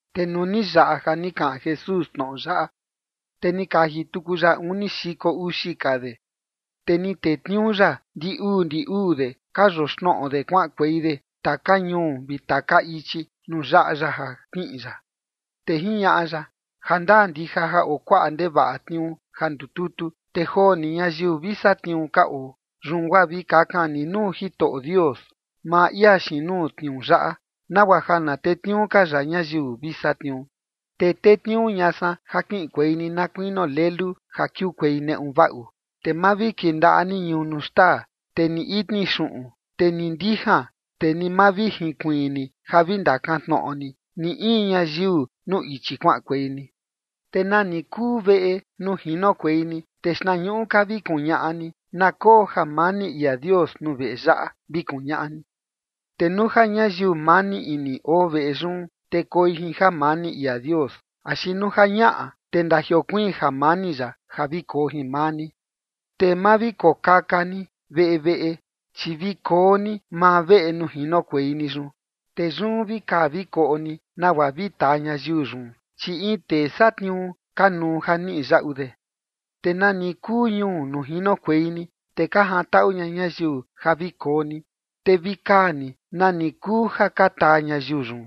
Te nuu ni yaꞌa ja ni kaꞌan Jesús tnoꞌo yaꞌa, te ni kaji tuku ya uni xiko uxi ka de, te ni tetniuu ya ndi uu ndi uu de ka yoxnoꞌo de kuaꞌankuei de taka ñuu vi taka ichi nuu yaꞌa ya ja kiꞌin ya. Te jiñaꞌa ya: ―Ja ndaa ndija ja oo kuaꞌa ndevaꞌa tniuu ja ndututu, te joo ni ñayiu vi satniuu ka oo. Yun guaa vi kakan ni nuu Jitoꞌo Dios, maa ia xiin nuu tniuu yaꞌa, nagua ja na tetniuu ka ya ñayiu vi satniuu. Te tetniuu ña san ja kiꞌinkuei ni na kuinio lelu ja kiukuei neꞌu vaꞌu. Te ma vi kindaꞌa ni ñunu xtaa, te ni itni xuꞌun, te ni ndijan, te ni ma vi jinkuiin ni ja vi ndakantnoꞌo ni, ni in ñayiu nuu ichi kuaꞌankuei ni. Te nani kuu veꞌe nuu jinokuei ni, te xtnañuꞌu ka vi kuñaꞌa ni: “Na koo jamani ia Dios nuu veꞌe yaꞌa”, vi kuñaꞌa ni. Te nuu ja ñayiu mani ini oo veꞌe yun, te koi jin jamani ia Dios. Axi nuu ja ñaꞌa, te ndajiokuiin jamani ya, ja vi koo jin maa ni. Te ma vi kokaka ni veꞌe veꞌe, chi vi koo ni maa veꞌe nuu jinokuei ni yun. Te yun vi kaa vi koꞌo ni nagua vi taa ñayiu yun, chi in tee satniuu kanuu ja niꞌi yaꞌu de. Te nani kuu ñuu nuu jinokuei ni, te ka jantaꞌu ña ñayiu ja vi koo ni, te vi kaa ni nani kuu ja ka taa ñayiu yun.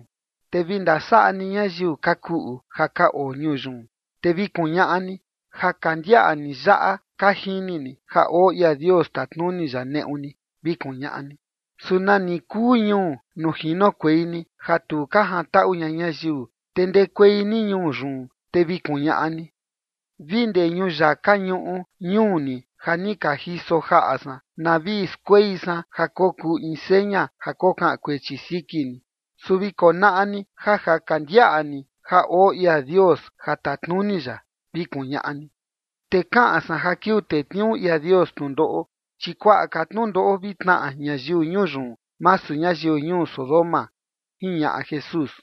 Te vi ndasaꞌa ni ñayiu ka kuꞌu ja ka oo ñuu yun, te vi kuñaꞌa ni: “Ja ka ndiaꞌa ni yaꞌa ka jini ni ja oo ia Dios tatnuni ya neꞌu ni”, vi kuñaꞌa ni. Su nani kuu ñuu nuu jinokuei ni, ja tu ka jantaꞌu ña ñayiu, te ndekuei ni ñuu yun, te vi kuñaꞌa ni: “Vi ndee ñuyaka ñuꞌu ñuu ni ja ni ka jiso jaꞌa san na vi skuei san ja kokuu in seña ja kokaꞌan kuechi siki ni. Su vi konaꞌa ni ja ja ka ndiaꞌa ni ja oo ia Dios ja tatnuni ya”, vi kuñaꞌa ni. Te kaꞌan san ja kiuu tetniuu ia Dios tnundoꞌo, chi kuakuaꞌa ka tnundoꞌo vi tnaꞌa ñayiu ñuu yun, masu ñayiu ñuu Sodoma ―jiñaꞌa Jesús.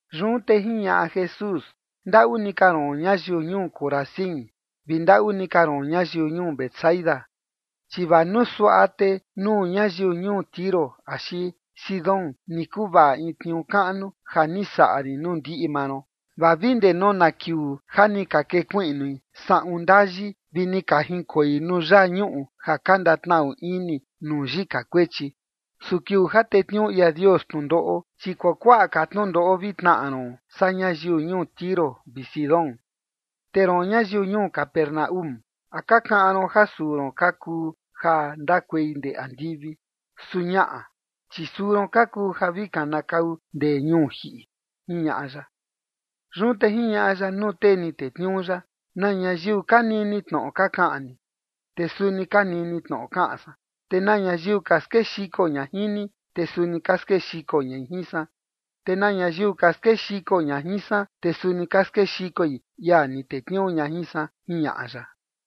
Yun te jiñaꞌa Jesús: ―¡Ndaꞌu ni ka ron ñayiu ñuu Corazín vi ndaꞌu ni ka ron ñayiu ñuu Betsaida! Chi vaa nuu suaꞌa, te nuu ñayiu ñuu Tiro axi Sidón ni kuvaꞌa in tniuu kaꞌnu ja ni saꞌa rin nuu ndiꞌi maa ron, vaa vi ndee nona kiuu ja ni ka kekuiꞌnui saꞌun ndayi vi ni ka jinkoi nuu yaa ñuꞌu ja ka ndatnaꞌu ini nuu yika kuechi. Su kiuu ja tetniuu ia Dios tnundoꞌo, chi kuakuaꞌa ka tnundoꞌo vi tnaꞌa ron saa ñayiu ñuu Tiro vi Sidón. Te roon ñayiu ñuu Capernaúm, ¿a ka kaꞌan ron ja suu ron ka kuu ja ndakuei ndee andivi? Su ñaꞌa, chi suu ron ka kuu ja vi kanakau ndee ñuu jiꞌi ―jiñaꞌa ya. Yun te jiñaꞌa ya nuu tee ni tetniuu ya: ―Na ñayiu ka nini tnoꞌo ka kaꞌan ni, te suni ka nini tnoꞌo kaꞌan san. Te na ñayiu ka skexiko ña jin ni, te suni ka skexiko ñai jin san. Te na ñayiu ka skexiko ña jin san, te suni ka skexikoi ia ni tetniuu ña jin san ―jiñaꞌa ya.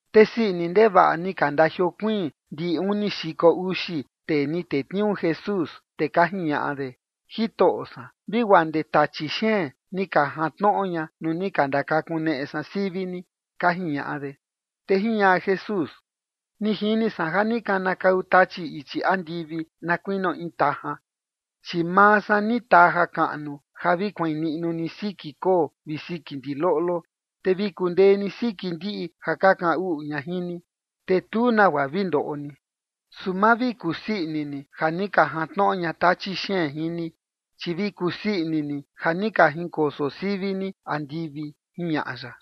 Te sii ini ndevaꞌa ni ka ndajiokuiin ndi uni xiko uxi tee ni tetniuu Jesús, te ka jiñaꞌa de: ―Jitoꞌo san, vi guaa ndee tachi xeen ni ka jantnoꞌo ña nuu ni ka ndakakuneꞌe san sivi ni ―ka jiñaꞌa de. Te jiñaꞌa Jesús: ―Ni jini san ja ni kanakau Tachi ichi andivi na kuinio in tajan, chi maa san ni taa jakaꞌnu ja vi kuain niꞌnu ni siki koo vi siki ndiloꞌlo. Te vi kundee ni siki ndiꞌi ja ka kaꞌan uꞌu ña jin ni, te tu nagua vi ndoꞌo ni. Su ma vi kusii ini ni ja ni ka jantnoꞌo ña tachi xeen jin ni, chi vi kusii ini ni ja ni ka jinkoso sivi ni andivi ―jiñaꞌa ya.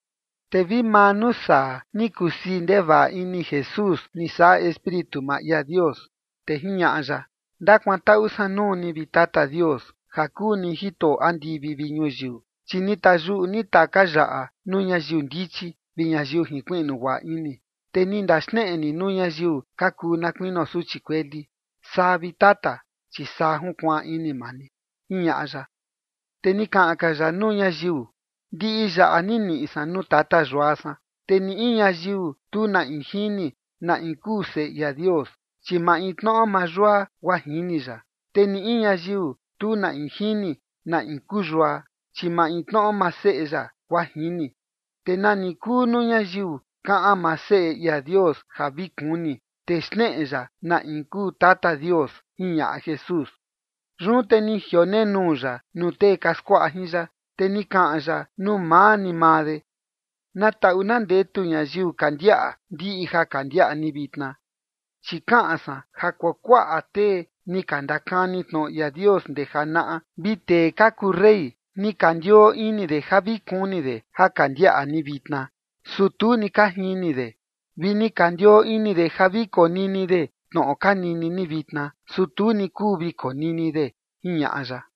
Te vi maa nuu saa, ni kusii ndevaꞌa ini Jesús ni saꞌa Espíritu maa ia Dios, te jiñaꞌa ya: ―Ndakuantaꞌu san nuu ni, vi Tata Dios, ja kuu ni Jitoꞌo andivi vi ñuyiu, chi ni tayuꞌu ni taka yaꞌa nuu ñayiu ndichi vi ñayiu jinkuiꞌnu guaꞌa ini, te ni ndaxneꞌe ni nuu ñayiu ka kuu na kuinio suchi kueli. Saa, vi Tata, chi saa junkuaan ini maa ni ―jiñaꞌa ya. Te ni kaꞌan ka ya nuu ñayiu: ―Ndiꞌi yaꞌa ni niꞌi san nuu Tata Yua san. Te ni in ñayiu tu na in jini na in kuu Seꞌe ia Dios, chi maintnoꞌo maa Yua, guaa jini ya. Te ni in ñayiu, tu na in jini na in kuu Yua, chi maintnoꞌo maa Seꞌe ya, guaa jini, te nani kuu nuu ñayiu kaꞌan maa Seꞌe ia Dios ja vi kuni, te xneꞌe ya na in kuu Tata Dios ―jiñaꞌa Jesús. Yun te ni jionenuu ya nuu tee ka skuaꞌa jin ya, te ni kaꞌan ya nuu maa ni maa de: ―Na taꞌu na ndetu ñayiu ka ndiaꞌa ndiꞌi ja ka ndiaꞌa ni vitna. Chi kaꞌan san ja kuakuaꞌa tee ni ka ndakani tnoꞌo ia Dios ndee janaꞌa vi tee ka kuu rey ni ka ndioo ini de ja vi kuni de ja ka ndiaꞌa ni vitna, su tu ni ka jini de. Vi ni ka ndioo ini de ja vi konini de tnoꞌo ka nini ni vitna, su tu ni kuu vi konini de ―jiñaꞌa ya.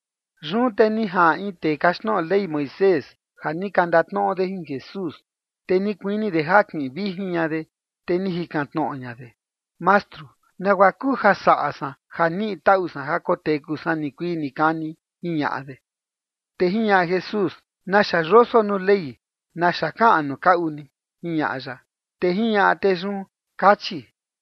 Yun te ni jaꞌan in tee kaxtnoꞌo Ley Moisés, ja ni ka ndatnoꞌo de jin Jesús, te ni kuini de ja kiꞌin vijin ña de, te ni jikan tnoꞌo ña de: ―Mastru, ¿nagua kuu ja saꞌa san ja niꞌi taꞌu san ja koteku san nikuii nikani? ―jiñaꞌa de. Te jiñaꞌa Jesús: ―¿Naxa yoso nuu Ley? ¿Naxa kaꞌan nuu kaꞌu ni? ―jiñaꞌa ya. Te jiñaꞌa tee yun: ―Kachi: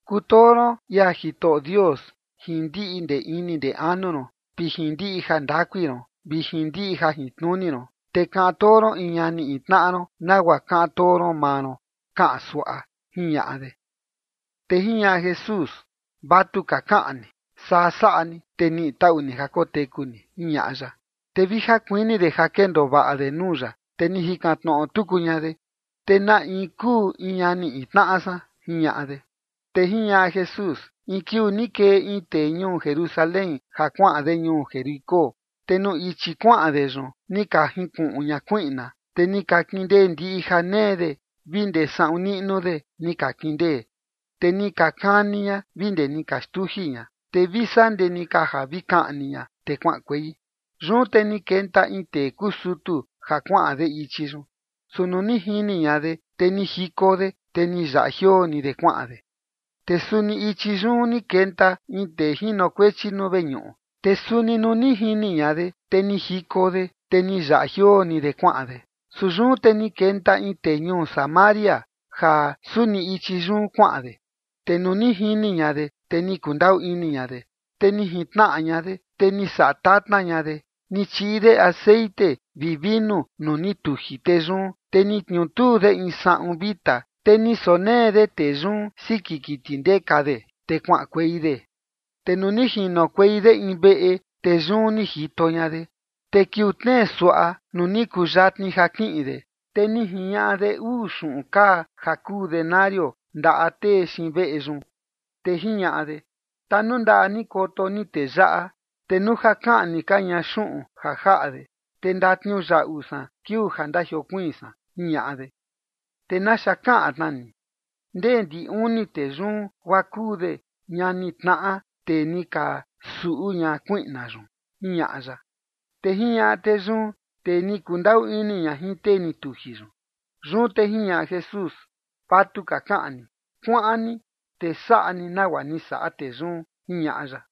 “Kutoo ron ia Jitoꞌo Dios jin ndiꞌi ndee ini ndee anu ron, vi jin ndiꞌi jandakui ron, vi jin ndiꞌi jajintnuni ron, te kaꞌan too ron in ñani in tnaꞌa ron nagua kaꞌan too ron maa ron”, kaꞌan suaꞌa ―jiñaꞌa de. Te jiñaꞌa Jesús: ―Vatuka kaꞌan ni. Saa saꞌa ni, te niꞌi taꞌu ni ja koteku ni ―jiñaꞌa ya. Te vi ja kuini de ja kendoo vaꞌa de nuu ya, te ni jikan tnoꞌo tuku ña de: ―Te ¿na in kuu in ñani in tnaꞌa san? ―jiñaꞌa de. Te jiñaꞌa Jesús: ―In kiuu ni kee in tee ñuu Jerusalén ja kuaꞌan de ñuu Jericó, te nuu ichi kuaꞌan de yun, ni ka jinkuꞌun ña kuiꞌna, te ni ka kindee ndiꞌi ja nee de vi ndee saꞌun niꞌnu de ni ka kindee. Te ni ka kani ña vi ndee ni ka xtuji ña, te vi saa ndee ni ka ja vi kaꞌni ña, te kuaꞌankuei. Yun te ni kenta in tee kuu sutu, ja kuaꞌan de ichi yun, su nuu ni jini ña de, te ni jiko de, te ni yaꞌa jioo ni de kuaꞌan de. Te suni ichi yun ni kenta in tee jinokuechi nuu veñuꞌu, te suni nuu ni jini ña de, te ni jiko de, te ni yaꞌa jioo ni de kuaꞌan de. Su yun te ni kenta in tee ñuu Samaria ja suni ichi yun kuaꞌan de. Te nuu ni jini ña de, te ni kundaꞌu ini ña de. Te ni jintnaꞌa ña de, te ni saꞌa tatna ña de. Ni chiꞌi de texeꞌen vi vinu nuu ni tuji tee yun. Te ni tniutuu de in saꞌun vita, te ni sonee de tee yun siki kiti ndeka de, te kuaꞌankuei de. Te nuu ni jinokuei de in veꞌe, te yun ni jito ña de. Te kiuu tnee suaꞌa nuu ni kuu yatni ja kiꞌin de, te ni jiñaꞌa de uu xuꞌun kaa ja kuu denario ndaꞌa tee xiin veꞌe yun, te jiñaꞌa de: “Tanundaꞌa ni koto ni tee yaꞌa, te nuu ja kaꞌni ka ña xuꞌun ja jaꞌa de, te ndatniuyaꞌu san kiuu ja ndajiokuiin san”, jiñaꞌa de. Te naxa kaꞌan tnaa ni, ¿ndee ndi uni tee yun guaa kuu de ñani tnaꞌa tee ni ka suꞌu ña kuiꞌna yun? ―jiñaꞌa ya. Te jiñaꞌa tee yun: ―Tee ni kundaꞌu ini ña jin tee ni tuji yun. Yun te jiñaꞌa Jesús: ―Vatuka kaꞌan ni. Kuaꞌan ni, te saꞌa ni nagua ni saꞌa tee yun ―jiñaꞌa ya.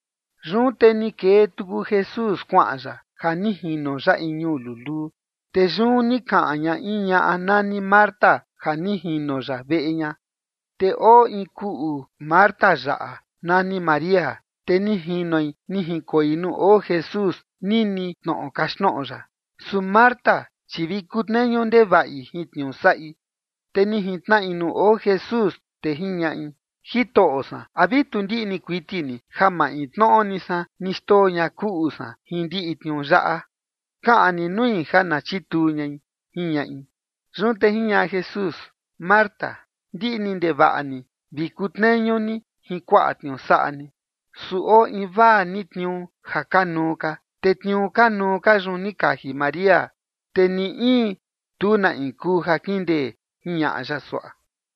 Yun te ni kee tuku Jesús kuaꞌan ya ja ni jino ya in ñuu luluu. Te yun ni kaꞌan ña in ñaꞌa nani Marta ja ni jino ya veꞌe ña. Te oo in kuꞌu Marta yaꞌa, nani María. Te ni jinoi ni jinkoi nuu oo Jesús, nini tnoꞌo kaxtnoꞌo ya. Su Marta, chi vi kutneñu ndevaꞌi jin tniuu saꞌi. Te ni jintnaꞌi nuu oo Jesús, te jiñaꞌi: ―Jitoꞌo san, ¿a vi tu ndiꞌni kuiti ni ja maintnoꞌo ni san ni xndoo ña kuꞌu san jin ndiꞌi tniuu yaꞌa? Kaꞌan ni nui ja na chituu ñai ―jiñaꞌi. Yun te jiñaꞌa Jesús: ―Marta, ndiꞌni ndevaꞌa ni vi kutneñu ni jin kuaꞌa tniuu saꞌa ni. Su oo invaa ni tniuu ja kanuu ka, te tniuu kanuu ka yun ni kaji María, te ni in tu na in kuu ja kindee ―jiñaꞌa ya suaꞌa.